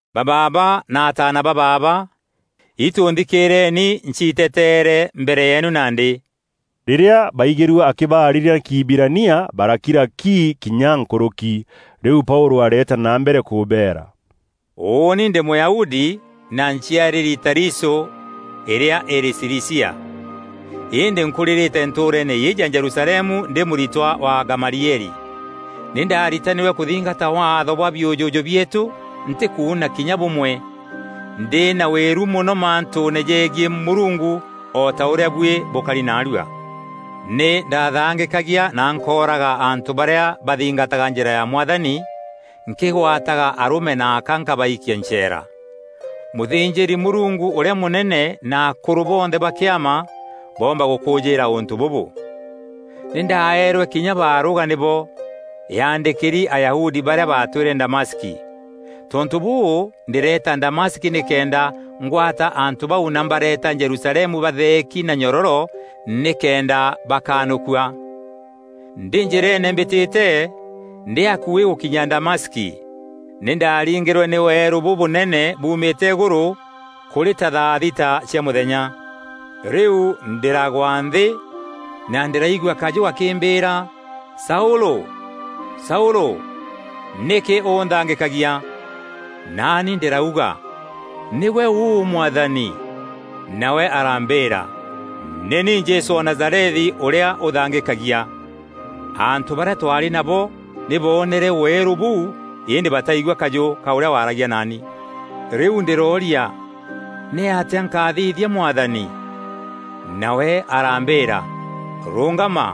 “Ba baaba na ataana ba baaba, itû nthikîîreeni nciiteteere mbere yeenu nandî!” Rîrîa baigîrue akîbaarîria na Kîhibirania, barakira ki kinya nkûrûki. Rîu Paûlû areeta na mbere kûbeera. “Ûûni ndî Mûyahudi, na nciarîri Tarisû îrîa îrî Cilicia. Îndî nkûrîrîte ntûûreene îîjî ya Jerusalemu ndî mûritwa wa Gamalieli. Nî ndaaritanîrwe kûthingata Waatho bwa biûjûjû bieetû ntîkuuna kinya bûmwe, ndî na wîru mono mantûûne jegiî Mûrungu o ta ûrîa buî bûkari naarua. Nî ndaathangîkagia na nkooraga antû barîa baathingataga Njîra ya Mwathani; nkîgwataga arûme na aka nkabaikia ncheera. Mûthînjîri-Mûrungu ûrîa mûnene na akûrû bonthe ba Kîama boomba gûkûjîîra ûntû bûbû. Nî ndaeerwe kinya barûga nîbo, yaandîkîri Ayahudi barîa baatwîre Damaski. Tontû bûû, ndîreeta Damaski nîkenda ngwata antû bau na mbareeta Jerusalemu batheeki na nyororo nîkenda bakanûkua. “Ndî njîreene mbîtîte, ndî akuî gûkinya Damaski, nî ndaaringîrwe nî weerû bûbûnene buumîte îgûrû, kûrî ta thaa thita cia mûthenya. Rîu ndîragwa nthî, na ndîraigua kajû gakîmbîîra: ‘Saûlû! Saûlû! Nîkî ûnthangîkagia?’ Naani ndîrauga, ‘Nîgwe ûû, Mwathani?’ Nawe arambîîra, ‘Nî ni Jesû wa Nazarethi, ûrîa ûthangîkagia.’ Antû barîa twaarî nabo nî boonere weerû bûu îndî bataigua kajû ka ûrîa waaragia naani. Rîu ndîrooria, ‘Nîatîa nkathithia, Mwathani?’ Nawe arambîîra, ‘Rûngama,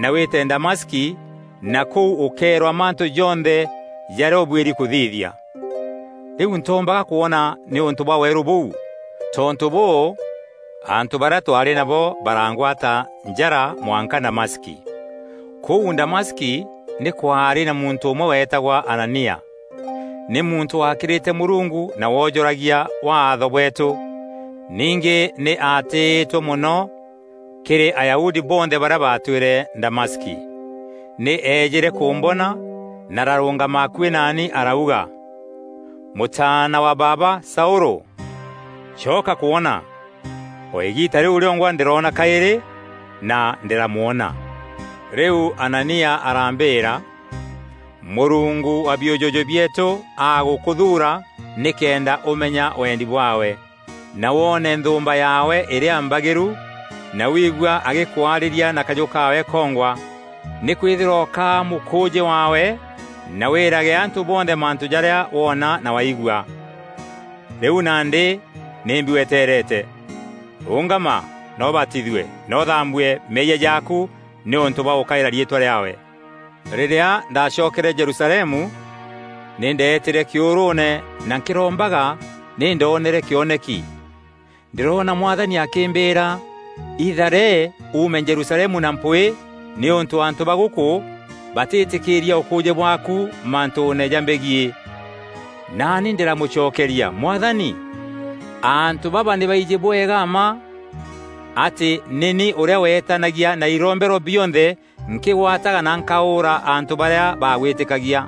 na wîte Damaski na kûu ûkeerwa mantû jonthe jarîa ûbuîri kûthithia.’ Rîu ntoombaga kwona nîûntû bwa weerû bûu. Tontû bûû, antû barîa twaarî nabo barangwata njara mwanka Damaski. “Kûu Damaski, nî kwaarî na muntû ûmwe weetagwa Anania. Nî muntû waakîrîte Mûrungu na woojûragia Waatho bweetû. Ningî nî aatîîtwe mono kîrî Ayahudi bonthe barîa baatwîre Damaski. Nî eejîre kûmbona, na ararûngama akuî naani arauga, ‘Mûtaana wa baaba Saûlû, coka kwona!’ O îgiita rîu rîongwa ndîroona kaîrî, na ndîramwona. Rîu Anania arambîîra, ‘Mûrungu wa biûjûjû bieetû agûkûthuura nîkenda ûmenya wendi bwaawe, na woone Nthûûmba yaawe îrîa Mbagîru, na wiigua agîkwarîria na kajû kaawe kongwa. Nîkwîthîrwa ûkaa mûkûûjî waawe na wîîrage antû bonthe mantû jarîa woona na waigua. Rîu nandî nîmbi wetereete? Rûngama na ûbatithue na ûthambue meeyia jaaku nîûntû bwa gûkaîra riîtwa rîaawe!’ “Rîrîa ndacokere Jerusalemu, nî ndeetîre kîûrûûne na nkîrombaga, nî ndoonere kîoneki. Ndîroona Mwathani akîmbîîra: ‘Ithare, uume Jerusalemu na mpwîî nîûntû antû ba gûkû batîîtîkîîria ûkûûjî bwaaku mantûûne jambegiî.’ Naani ndîramûcokeria, ‘Mwathani, antû baba nî baijî bwega mma atî nî ni ûrîa weetanagia na irombero bionthe nkîgwataga na nkaûûra antû barîa baagwîtîkagia.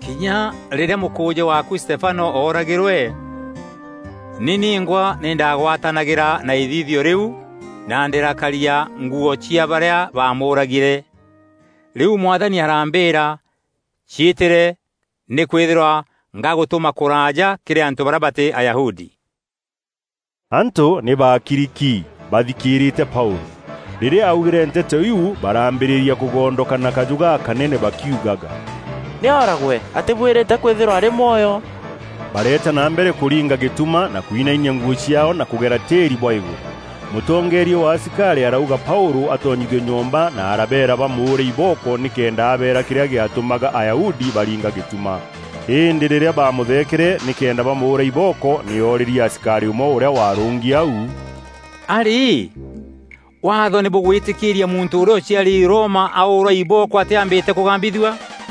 Kinya rîrîa mûkûûjî waaku Stefano ooragîrwe, ni ningwa nî ndaagwatanagîra na îthithio rîu na ndîrakaria nguû cia barîa baamûûragîre.’ Rîu Mwathani arambîîra, ‘Ciîtîre, nîkwîthîrwa ngagûtûma kûraaja, kîrî antû barîa batî Ayahudi.’” Antû nî baakiri ki, baathikîîrîte Paûlû. Rîrîa aaugîre nteto iu, barambîrîria kûgondoka na kajû gakanene bakiugaga, “Nî ooragwe! Atîbuîrîte kwîthîrwa arî mwoyo.” Bareeta na mbere kûringa gîtuma na kuinainia nguû ciaao na kûgera tîîri bwa îgûrû. Mûtongeeria wa asikarî arauga Paûlû atonyithue nyomba na arabeera bamûûre ibooko nîkenda abeera kîrîa gîatûmaga Ayahudi baringa gîtuma. Îndî rîrîa baamûtheekere nîkenda bamûûra ibooko, nî oorîrie asikarî ûmwe, ûrîa waarûngi au, “A-rî, Waatho nî bûgwîtîkîîria muntû ûrîa ûciarîri Roma aûûrwa ibooko atîambîte kûgambithua?”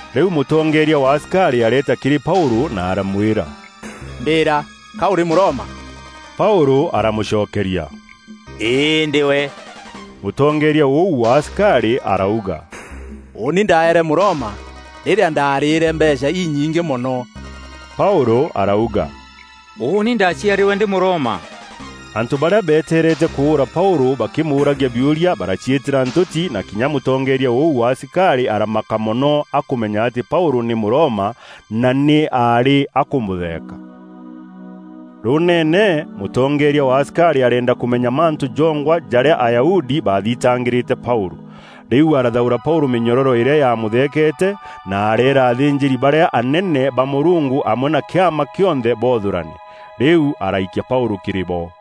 Rîu mûtongeeria wa asikarî areeta kîrî Paûlû na aramwîra, “Mbîîra, ka ûrî Mûroma?” Paûlû aramûcokeria, “Îî ndîwe.” Mûtongeeria ûu wa asikarî arauga, “Ûûni ndaeere Mûroma rîrîa ndaarîîre mbeecha inyingî mono.” Paûlû arauga, “Ûûni ndaaciarîrwe ndî Mûroma.” Antû barîa beeteerete kûûra Paûlû bakîmûûragia biûria baraciîtîra ntûti na kinya mûtongeeria ûu wa asikarî aramaka mono akûmenya atî Paûlû nî Mûroma na nî aarî akûmûtheeka. Rûûneene, mûtongeeria wa asikarî areenda kûmenya mantû jongwa jarîa Ayahudi baathitangîrîte Paûlû. Rîu arathaûra Paûlû mînyororo îrîa yaamûtheekete, na areera athînjîri barîa anene ba Mûrungu amwe na Kîama kîonthe boothûrane. Rîu araikia Paûlû kîrî bo.